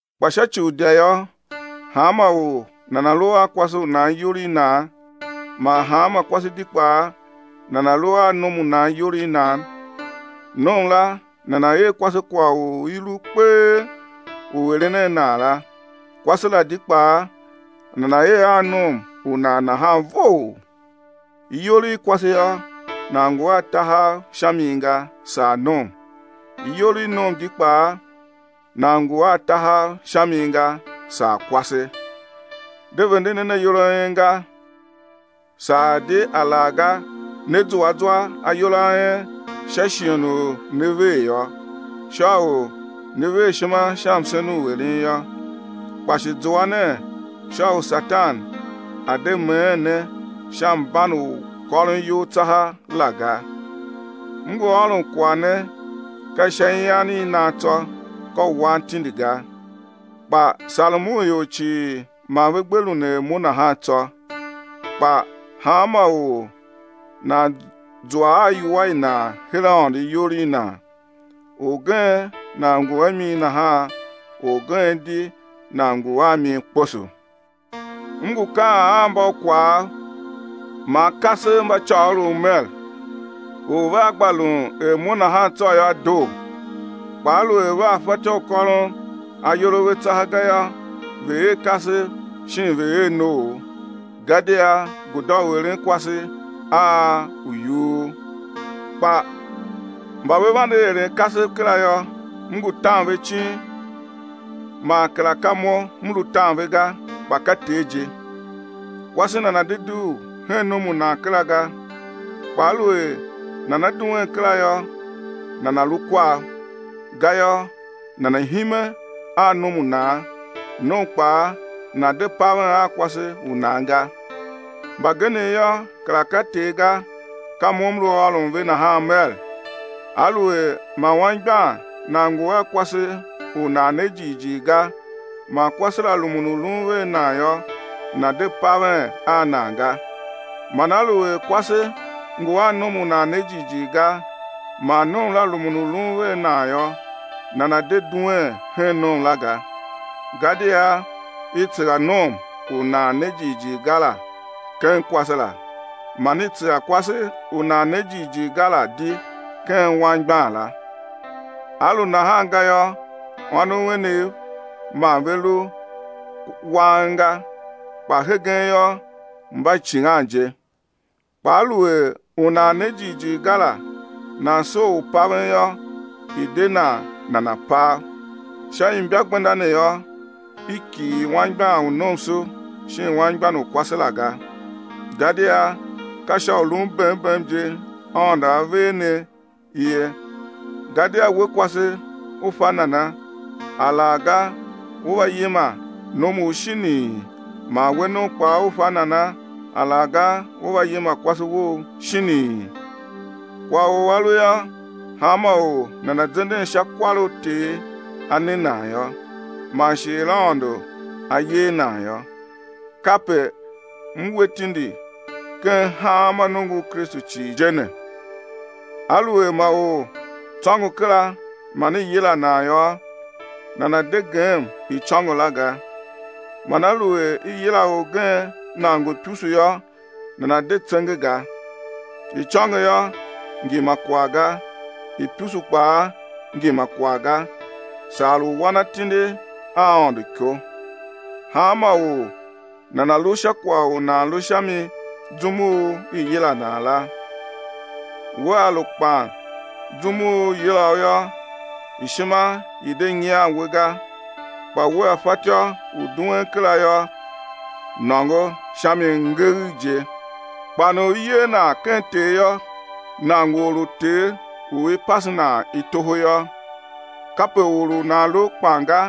Kpa sha ci u idya yô, hanma or nana̱ lu a kwase u nan iyol i nan, man hanma kwase di kpaa nana̱ lu a nom u nan iyol i nan. Nom la nana̱ er kwase kwagh u i lu kpee u eren a nan la, kwase la di kpaa nana̱ er a nom u nan nahan vough. Iyol i kwase yô, nan ngu a tahav sha mi ga, saa nom. Iyol i nom di kpaa nan ngu a tahav sha mi ga, saa kwase. De vende nen ayol a en ga, saa di alaghga né zua zwa ayol a en sha shighe u né ver yô, sha u ne ver ishima sha msen u eren yô, kpa shi zua nen sha u Satan a̱ de meen ne sha mban u kôron iyol tsaha la ga. M ngu ôron kwagh ne ka sha ian i nan tsô, ka u wan tindi ga. Kpa sarem u ior cii ma ve gbe lun er mo nahan tsô. Kpa hanma or nan zua a iwua i nan her Aôndo iyol i nan; orgen nan ngu a mi nahan, orgen di nan ngu a mi kposo. M ngu kaan a mbaukwav man kasev mba côgholov mer: U vea gba lun er mo nahan tsô yô, doo. Kpa aluer vea fatyô u kôron ayol a ve tsaha ga yô, ve̱ er kasev shin ve̱ er noov. Gadia guda u eren kwase a u yughur. Kpa mba ve vande eren kasev kera yô, m ngu tan ve icin man kera ka mo m lu tan ve ga, kpa ka Ter je: Kwase nana̱ de dugh hen nom u nan kera ga. Kpa aluer nana duen kera yô, nana̱ lu kwav, gayô nana̱ hime a nom u nan; nom kpaa, nana̱ de paven a kwase u nan ga. Mbagenev yô, kera ka Ter ga, ka mo m lu ôron ve nahan mer: Aluer ma anmgbian nan ngu a kwase u nan ne jighjigh ga, man kwase la rumun u lun vea nan yô, nana̱ de paven a nan ga. Man aluer kwase ngu a nom u nan ne jighjigh ga, man nom la rumun u lun vea nan yô, nana̱ de duen hen nom la ga. Gadia i tsegha nom u nan ne jighjigh ga la ken kwase la, man i tsegha kwase u nan ne jighjigh ga la di ken anmgbian la. A lu nahan ga yô, ônov enev ma ve lu wang ga, kpa hegen yô, mba icighan je. Kpa aluer u nan ne jighjigh ga la nan soo u paven yô, i̱ de nan nana̱ pav. Sha imbagbenda ne yô, i kighir anmgbian u nomso shin anmgbian u kwase la ga. Gadia ka sha u lun bem bem je Aôndo A ver ne ye. Gadia we kwase, u fa nana, alaghga ú va yima nomu shinii? Man we nom kpaa, u fa nana, alaghga ú va yima kwase wou shinii? Kwagh u a lu yô, hanma or nana̱ zenden sha kwar u Ter A ne nan yô, man shi er Aôndo A yer nan yô. Kape m we tindi ken hanma nongo u Kristu cii je ne. Aluer ma or tsôngo kera man i yila nan yô, nana̱ de gem icôngo la ga. Man aluer i yila orgen nan ngu ipusu yô, nana̱ de tsenge ga. Icôngo yô, ngi ma kwagh ga, ipusu kpaa ngi ma kwagh ga, saa u wan atindi a Aôndo iko. Hanma or nana̱ lu sha kwagh u nan lu sha mi zum u i yila nan la. Wea lu kpan zum u i yila u yô, ishima i̱ de nyian we ga, kpa wea fatyô u duen kera yô, nôngo sha mi ngeegh je. Kpan u i yer nan ken Ter yô, nan ngu or u Ter u i pase nan i toho yô. Kape or u nan lu kpan ga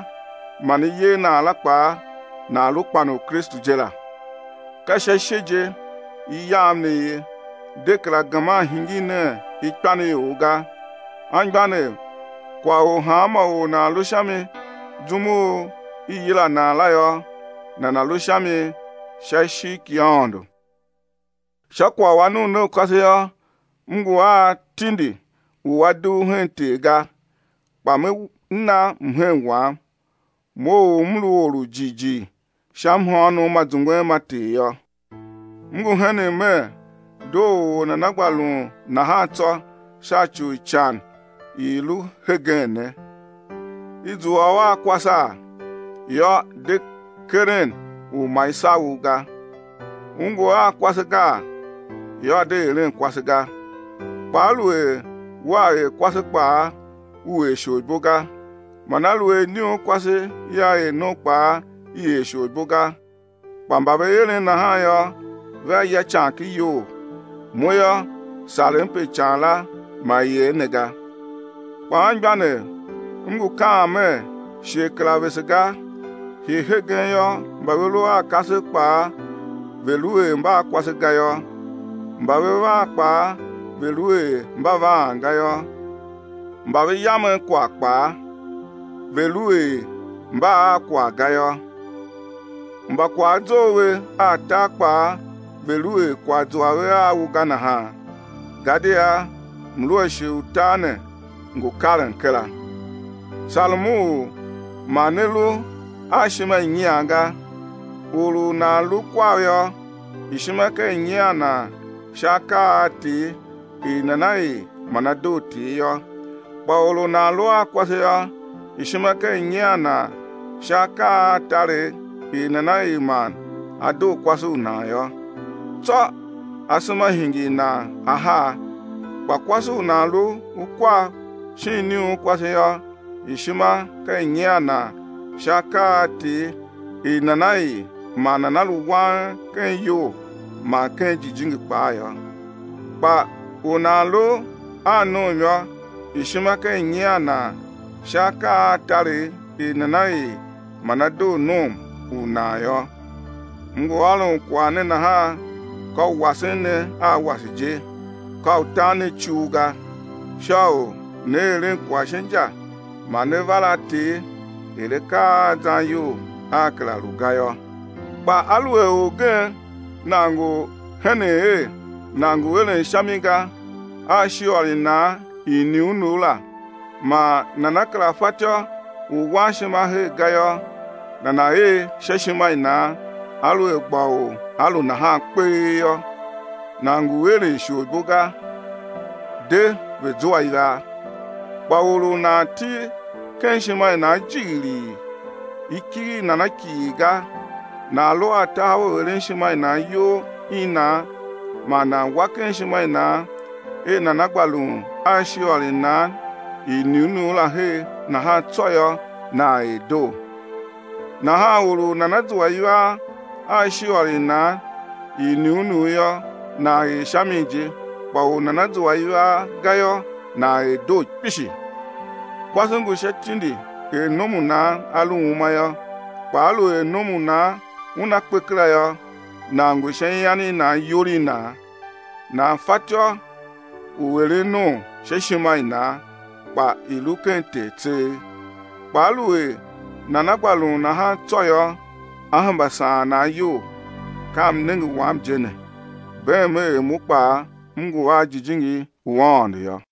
man i yer nan la kpaa, nan lu kpan u Kristu je la. Ka sha ishe je i yam ne ye, de kera geman hingir nen ikpan i ior ga. Anmgbianev, kwagh u hanma or nan lu sha mi zum u i yila nan la yô, nana̱ lu sha mi sha ishigh ki Aôndo. Sha kwagh u anuunaukase yô, m ngu a tindi u a dugh hen Ter ga, kpa me na mhen wam, mo u m lu or u jighjigh sha mhôônom ma zungwen ma Ter yô. M ngu henen mer, doo u or nana gba lun nahan tsô sha ci u ican i i lu hegen ne. I zua u a kwasaa? Yô de keren u ma i sagh u ga. U ngu a kwase gaa? Yô, de eren kwase ga. Kpa aluer wea er kwase kpaa, u er isholibo ga. Man aluer iniunkwase la er nom kpaa i er isholibo ga. Kpa mba ve eren nahan yô, vea ya ican ken iyol. Mo yô, sarem pe ican la ma i er ne ga. Kpa anmgbianev, m ngu kaan mer, shighe kera vese ga. Hii hegen yô, mba ve lu a kasev kpaa, ve̱ lu er mba a kwase ga yô. Mba ve vaan kpaa ve̱ lu er mba vaan ga yô, mba ve yamen kwagh kpaa, ve̱ lu er mba a kwagh ga yô. Mba kwagh a zough ve a tar kpaa ve̱ lu er kwagh zua ve a u ga nahan. Gadia mluashe u tar ne ngu karen kera. Sarem u ma ne lu a ishima i nyian ga. Or u nan lu kwav yô, ishima ka i nyian nan sha akaa a Ter, er nana er man á doo Ter yô. Kpa or u nan lu a kwase yô, ishima ka i nyian nan sha akaa a taregh, er nana er man á doo kwase u nan yô, tsô asema hingir nan ahar. Kpa kwase u nan lu kwav shin iniunkwase yô, ishima ka i nyian nan sha akaa a Ter er nana er man nana lu wang ken iyol man ken jijingi kpaa yô. Kpa u nan lu a nom yô, ishima ka i nyian nan sha akaa a taregh er nana er man á doo nom u nan yô. M ngu ôron kwagh ne nahan ka u wasen ne a wase je, ka u tan ne icul ga, sha u né eren kwagh sha inja man né var a Ter er akaa a zan iyol aa kera lu ga yô. Kpa aluer orgen nan ngu henen er nan ngu eren sha mi ga a ishiôr i nan i iniunugh la man nana kera fatyô u wan ishima her ga yô, nana̱ er sha ishima i nan aluer gba u a lu nahan kpee yô; nan ngu eren isholibo ga; de, ve̱ zua ivaa. Kpa or u nan til ken ishima i nan jighilii, i kighir nan a kighir ga, nan lu a tahav u eren ishima i nan iyol i nan man nan wa ken ishima i nan er nana gba lun a ishiôr i nan i iniunugh la her nahan tsô yô, nan er doo. Nahan or u nana zua ivaa a ishiôr i nan i iniunugh yô, nan er sha mi je, kpa u nana zua ivaa ga yô, nan er doo kpishi. Kwase ngu sha tindi er nom u nan a lu uma yô. Kpa aluer nom u nan una kpe kera yô, nan ngu sha ian i nan iyol i nan, nan fatyô u eren nom sha ishima i nan, kpa i̱ lu ken Ter tseegh. Kpa aluer nana gba lun nahan tsô yô, á hemba saan nan iyol; ka mnenge wam je ne. Beem er mo kpaa, m ngu a Jijingi u Aôndo yô.